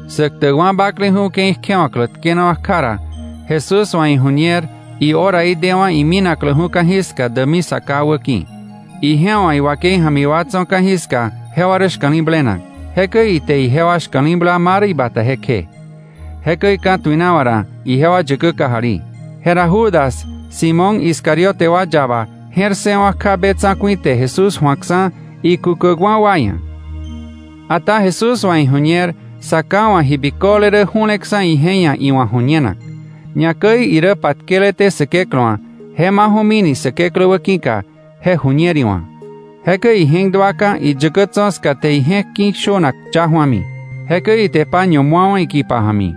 Säktäkwa̱ bakleju̱ ke̱i kjewa̱klä tkenawa̱ kja ra, Jesús wa̱ iju̱ñer ihoraí dewa̱ iminakläju̱ ka̱jiska däkmi Sa Ká wäki̱. Ije wa̱ iwakei ja̱mi wa tso̱ ka̱jiska jewa rä shka̱li̱blenak, jekäi ite ijewa shka̱li̱bla ma rä ibata jekje. Jekäi ka̱tuinawa̱ ra ijewa yäkä kajali. Jera Judas, Simón Iscariote wa yaba, je̱r ssëwa̱ kja be tsa̱ku̱i te Jesús ju̱akksa̱ ikukäkwa̱ wa ia̱. Ata Jesús wa̱ iju̱ñer Sa Ká wa̱ ji biköle rä ju̱leksa̱ ije ia̱ iwa̱ ju̱ñenak. Ñakäi irä patkeleté Säkeklä wa̱, je maju̱mini Säkeklä wäki̱ka, je ju̱ñer iwa̱. Jekäi ije̱k duaka̱ iyäkä tso̱ ska te ije̱k ki̱ shönak ya ju̱ami, jekäi ite paño mu̱awa̱ ikipa ja̱mi.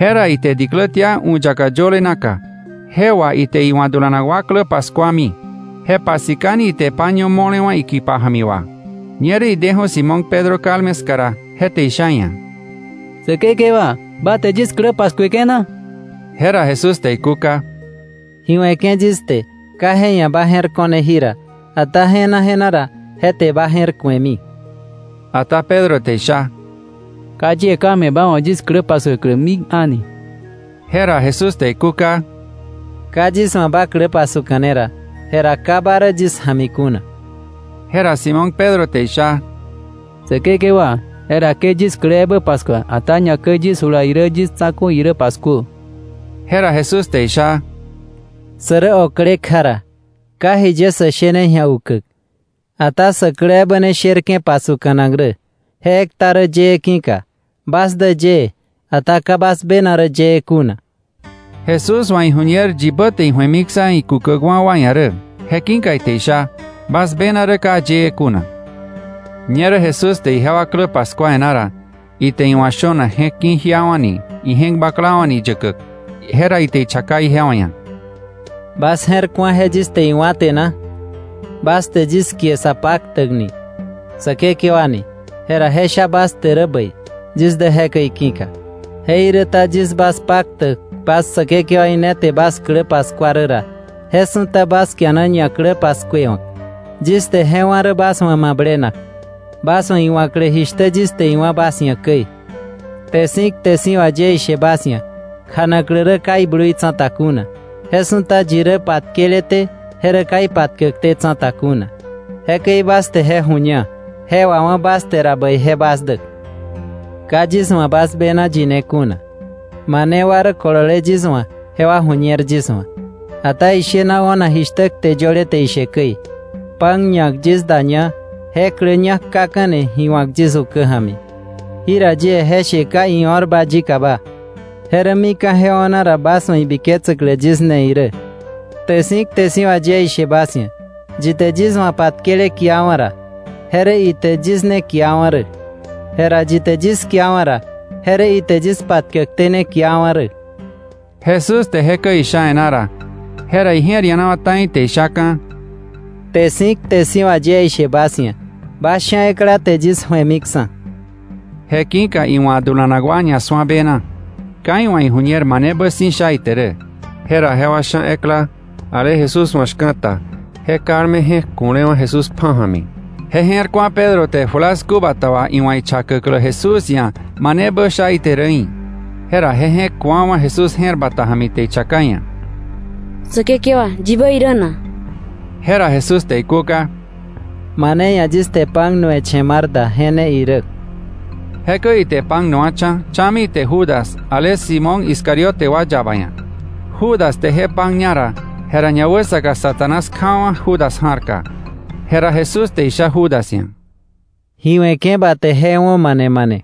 Jera ite diklä tia u̱ yaka yöle naka, je wà ite iwa̱ dulanak wa klä paskuami, je pasikani ite paño mo̱lewa̱ ikipa ja̱mi wà. Ñerä ideju̱ Simón Pedro kalme ska ra, je te isha iia̱: —Säkekewa, ¿ba te yis klä paskueke̱ na? Jera Jesús te ikúka: —Ji we̱ke̱ yis te, ka je ia̱ ba je̱r ko̱ne jira, ata je̱na je̱na ra, je te ba je̱r ku̱emi. Ata Pedro te isha: —Ka yie ka̱ me̱ ba wa̱ yis klä paskuäklä mik a̱ni. Jera Jesús te ikúka: —Ka yis wa̱ ba klä pasuka̱ne ra, jera ka ba rä yis ja̱mi kuna. Jera Simón Pedro te isha: —Säkekewa, jera ke yis klä ebä paskua, ata ñakäi yis jula irä yis tsa̱ku̱ irä paskuö. Jera Jesús te isha: —Sä rä okle kja ra, ka jiye sä shene ji̱a ukäk. Ata sä klä ebä ne sherke̱ pasuka̱nak rä, je ekta rä yëë ki̱ka. Bas dä yëë, ata ka bas bena rä yëë kuna. Jesús wa̱ iju̱ñer yibä te iju̱emiksa̱ ikukäkwa̱ wa ia̱ rä. Je ki̱ka ite isha: “Bas bena rä ka yëë kuna.” Ñerä Jesús te ijewa klä paskua e̱ná ra, ite iwa̱ shönak je̱k ki̱ jiawa̱ni je̱k baklawa̱ni yäkäk, jera ite ichaka ijewa ia̱: —¿Bas je̱r ku̱a je yis te iwá̱ te na? Bas te yis kie Sapaktäk ni, Säkekewa ni. Jera je sha bas te rä bäi, yis dä jekäi ki̱ka. Jeiräta yis bas Paktäk bas Säkekewaí ne te bas klä paskua rä ra, je su̱ta bas kiana ñaklä paskuewa̱k. Yis te je wá̱ rä bas wa̱ mablenak, bas wa̱ iwa̱klä jishtä yis te iwá̱ bas ia̱ käi. Kte si̱ kte si̱ wà yie ishe bas ia̱, kjanaklä rä ka iblui tsa̱ta kuna, je su̱ta yi rä patkeleté je rä ka ipatkäkté tsa̱ta kuna. Jekäi bas te je ju̱ña, je wawá̱ bas te ra, bäije bas dä. Ka yis wa̱ bas bena yine kuna. Mane wa rä kolole yis wa̱ jewa ju̱ñer yis wa̱. Ata ishena o̱nak jishtä kte yöle te ishe käi: “Pan ñak yis daña, je klä ñak kaka̱ni ji wa̱k yis ukä ja̱mi.” Jira yie je she ka io̱rba yikaba. Je rä mika̱ je o̱na ra bas wa̱ ibiketsäklä yis ne irä. Kte si̱ kte si̱ wà yie ishe bas ia̱, yi te yis wa̱ patkele kiawa̱ ra, je rä ite yis ne kiawa̱ rä; jera yi te yis kiawa̱ ra, je rä ite yis patkäkté ne kiawa̱ rä. Jesús te jekäi isha e̱ná ra, jera ije̱r ianawa̱ ta̱i te ishaka̱: —Kte si̱ kte si̱ wà yie ishe bas ia̱, bas sha̱ ekla te yis ju̱emiksa̱. Je ki̱ka iwa̱ dulanak wa ñasu̱a bena, ka iwa̱ iju̱ñer manebä si̱ sha ite rä. Jera jewa sha̱ ekla, ale Jesús wa̱ shka̱ta, je kalme je̱k ku̱lewa̱ Jesús pja̱ ja̱mi, je je̱r ku̱a Pedro te julasku bata wà iwa̱ ichakäklä Jesús ia̱ manebä sha ite rä í̱. Jera je je̱k ku̱wa̱wa̱ Jesús je̱r bata ja̱mi, te ichaka iia̱: —Säkekewa, ¿yibä irä na? Jera Jesús te ikúka: —Mane ia̱ yis te pan nu̱we̱ che̱ mar da ra, je ne irä. Jekäi ite pan nu̱wa̱cha̱, cha̱mi ite Judas, ale Simón Iscariote wa yaba ia̱. Judas te je pan ñara, jera ñawäsaka Satanás kjawa̱ Judas ja̱rka. Jera Jesús te isha Judas ia̱: —Ji we̱ke̱ ba te, je wo̱ mane mane.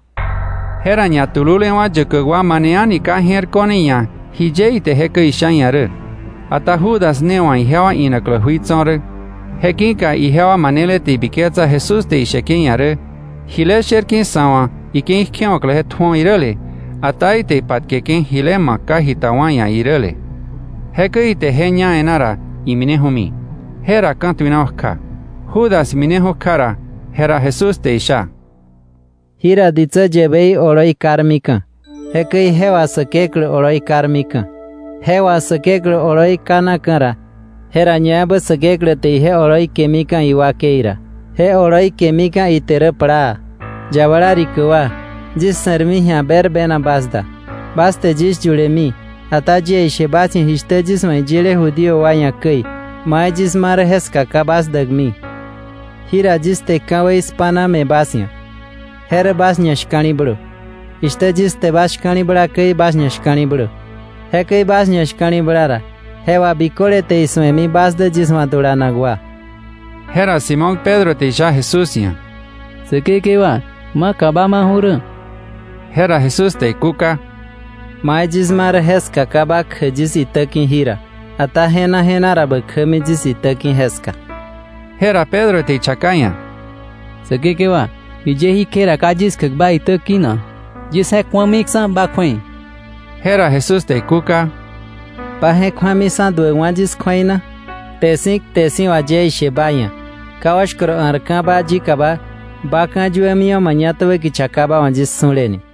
Jera ñatululewa̱ yäkäk wa mane a̱ni ka je̱r ko̱ne iia̱ jiye ite jekäi isha iia̱ rä. Ata Judas ne wa̱ ijewa inaklä jui tso̱ rä, je ki̱ka ijewa manele te ibiketsa Jesús te isheke̱ iia̱ rä: “Jile sherke̱ sa̱ wa̱ ike̱i kjewa̱klä je tju̱o” iräle, ata ite ipatkeke̱ jile ma̱k ka jita wa ia̱ iräle. Jekäi ite je ña e̱ná ra, imineju̱mi. Jera ka̱tuinawa̱ kja. Judas mineju̱ kja ra, jera Jesús te isha: —Jira ditsä yäbei oloi karmika̱, jekäi je wà Säkeklä oloi karmika̱. Je wà Säkeklä oloi kanaka̱ ra, jera ñaebä Säkeklä te ije oloi kemika̱ iwakei ra. Je oloi kemika̱ ite rä plaa. Yabala rikä wa, yis se̱rmi ji̱a berbena bas da. Bas te yis yulemi, ata yie ishe bas ia̱ jishtä yis wa̱ iyile Judío wa ia̱ käi: ‘Mai yis ma rä jeska ka bas däkmi.’ Jira yis te ka̱wei spa̱na me̱ bas ia̱, je rä bas ñashka̱li̱blö. Jishtä yis te bas shka̱li̱bla käi, bas ñashka̱li̱blö. Jekäi bas ñashka̱li̱bla ra, je wà biköle te isu̱emi bas dä yis wa̱ dulanak wa. Jera Simón Pedro te isha Jesús ia̱: —Säkekewa, ¿maka ba maju̱ rä? Jera Jesús te ikúka: —Mai yis ma rä, jeska ka ba kjäk yis itä ki̱ jira, ata je̱na je̱na ra bä kjämi yis itä ki̱ jeska. Jera Pedro te ichaka iia̱: —Säkekewa, ¿jiye jí kje ra ka yis kjäk ba itä ki̱ na? Yis je̱k ju̱amiksa̱ ba kju̱ei. Jera Jesús te ikúka: —¿Ba je̱k ju̱amiksa̱ duäkwa̱ yis kju̱ei na? Kte si̱ kte si̱ wà yie ishe ba ia̱, ka oshkoro a̱rka̱ba yikaba, ba ka̱yuämiwa̱ mañatäbä kicha ka ba wa̱ yis su̱le ni.